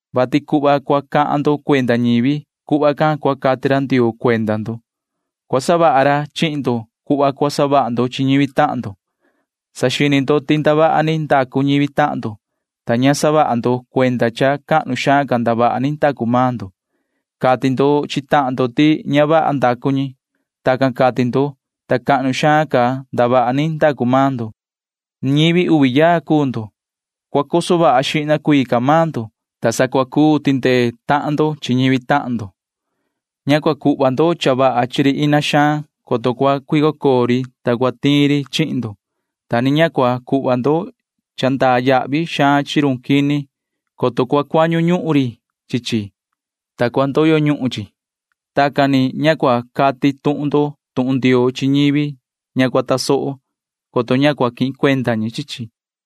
vati cuhva cua cati ndo cuenda ñivi―cuhva can cua cati ra Ndioo cuenda maan ndo. Cua savaha ra chihin ndo cuhva cua savaha maan ndo chi ñivi tahan ndo. Saxini ndo ti ndavaha ni ndacu ñivi tahan ndo, ta ña saha ndo cuenda ti cahnu xaan ca ndavaha ni ndacu maan ndo. Cati ndo chi tahan ndo ti ña vaha ndacu ñi. Tacan ni savaha ndo, ta cahnu xaan ca ndavaha ni ndacu maan ndo. Ñivi uvi yaa cuu ndo. Cua coso vaha xihna maan ndo, ta sa cua cuu tindee tahan ndo chi ñivi tahan ndo. ’Ña cua cuhva ndo cha vaha chi run ina xaan, coto cua cuico coo ri ina can, ta cua tiin ri chihin ndo, ta ni ña cua cuhva ndo cha ndaa yahvi chi run quini, coto cua cuañu ri chi chi, ta cua ndoyo ñuhun chi. [Tacan ni ña cua cati tuhun ndo tuhun Ndioo chi ñivi ña cua tasoho, coto ña cua quihin cuenda ñi chi chi.]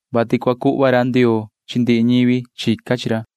vati cua cuhva ra Ndioo chi ndihi ñivi chica chi ra.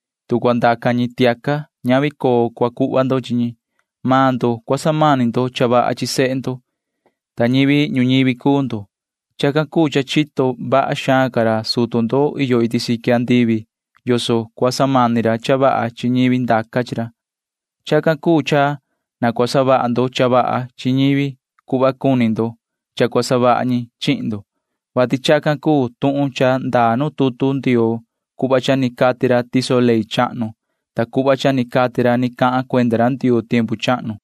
Tu cua ndaca ra tiaca, ña cua cuhva ndo iin coo chi ra. Chito maan ndo yoso cua samani ndo cha vaha chi sehe ndo, ta ñivi ñuñivi cuu ndo. Chacan cuu cha chito vaha xaan ca ra sutu ndo iyo iti siqui andivi yoso cua samani ra cha vaha chi ñivi ndaca chi ra. ’Chacan cuu cha na cua savaha maan ndo cha vaha chi ñivi cuhva cuni ndo cha cua savaha ñi chihin ndo, vati chacan cuu tuhun iyo tutu Ndioo cuhva cha ni cati ra tiso ley chahnu cuhva cha ni cati ra ni cahan cuenda ra Ndioo tiempu chahnu.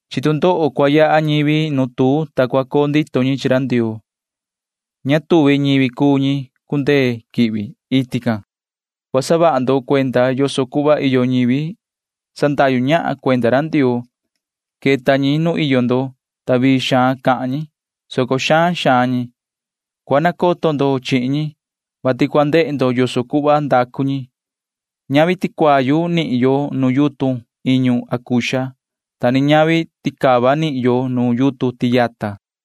Chi tu ndoho cua yaha ñivi nu tuu, ta cua coo ndito ñi chi ra Ndioo. Ña tuvi ñi cuu ñi cundee quihvi iti can. [Ni vii cahan ra Jesuu chi ñivi can:] ’Cua saha ndo cuenda yoso cuhva iyo ñivi sandahyu ñahan cuenda ra Ndioo. Queta ñi nu iyo ndo, ta vii xaan cahan ñi, soco xaan xaan ñi cuu. Cua nacoto ndo chihin ñi, vati cua ndehe ndo yoso cuhva ndacu ñi. Ña nihin yo ticuayu nu yutun iñu acuxa, ta ni ña nihin yo ticava nu yutun tiyata.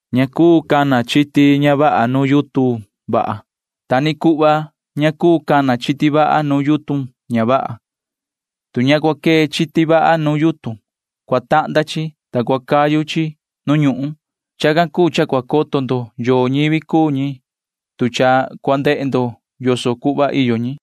Ña cuu cana chiti ña vaha nuun yutun vaha. Ta ni cuhva ña cuu cana chiti vaha nuun yutun ña vaha. Tu ña cua cana chiti vaha nuun yutun, cua tahnda chi, ta cua cayu chi nu ñuhun. Chacan cuu cha cua coto ndo yoo ñivi cuu ñi, tu cha cua ndehe ndo yoso cuhva ndacu ñi.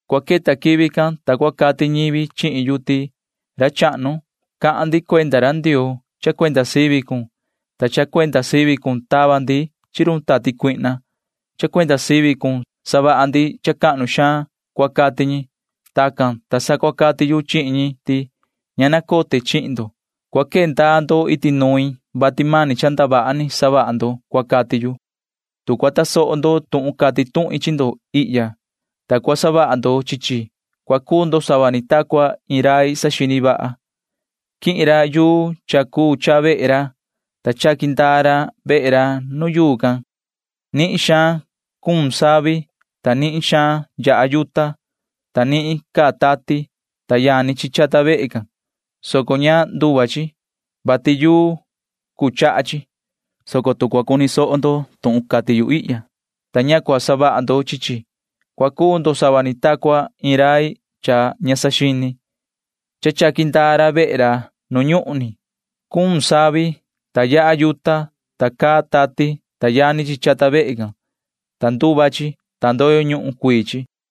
Cua queta quivi can, ta sa cua cati ñivi chihin yu ti: “Yoho ra chahnu, cha cuenda sivi cun cahan ndi cuenda ra Ndioo. Cha cuenda sivi cun tava ndaa ndi chi run tati cuihna. Cha cuenda sivi cun savaha ndi cuhva cahnu xaan,” cua cati ñi. Tacan, ta sa cua cati main chi ñi ti: “Ña nacote chihin ndo. Cua quee ndaa ndo iti nuin, vati mani cha ndavaha ni savaha ndo,” cua cati yu. [Ni vii cahan ra Jesuu chi ñivi can:] ’Tu cua tasoho ndo tuhun cati tuhin chi ndo ihya, ta cua savaha ndo chi chi, cua cuu ndo sava ni ta cua iin rai saxini vaha. Quihin ra yuu cha cuu chaha vehe ra, ta chaqui ndaa ra vehe ra nuun yuu can. Nihin xaan cuun savi, ta nihin xaan yaha yuta, ta nihin caa tati, ta yani chi chata vehe can, soco ña nduva chi, vati yuu cuu chaha chi. Tu cua cuni ndo tuhun cati yu ihya, ta ña cua savaha ndo chi chi, cua cuu ndo sava ni ta cua iin rai tondo xini. Chaqui ndaa ra vehe ra nu ñuhun ni. Cuun savi, ta yaha yuta, ta caa tati, ta yani chi chata vehe can, ta nduva chi, ta ndoyo ñuhun cuii chi.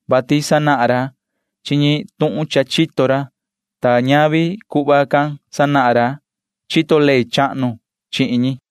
vati sacuaha ra chi ñi cuhva ni chito ra ñaan tuhun sacuaha ra, ta ñavi tacan sacuaha ra chito ley chahnu chi ñi.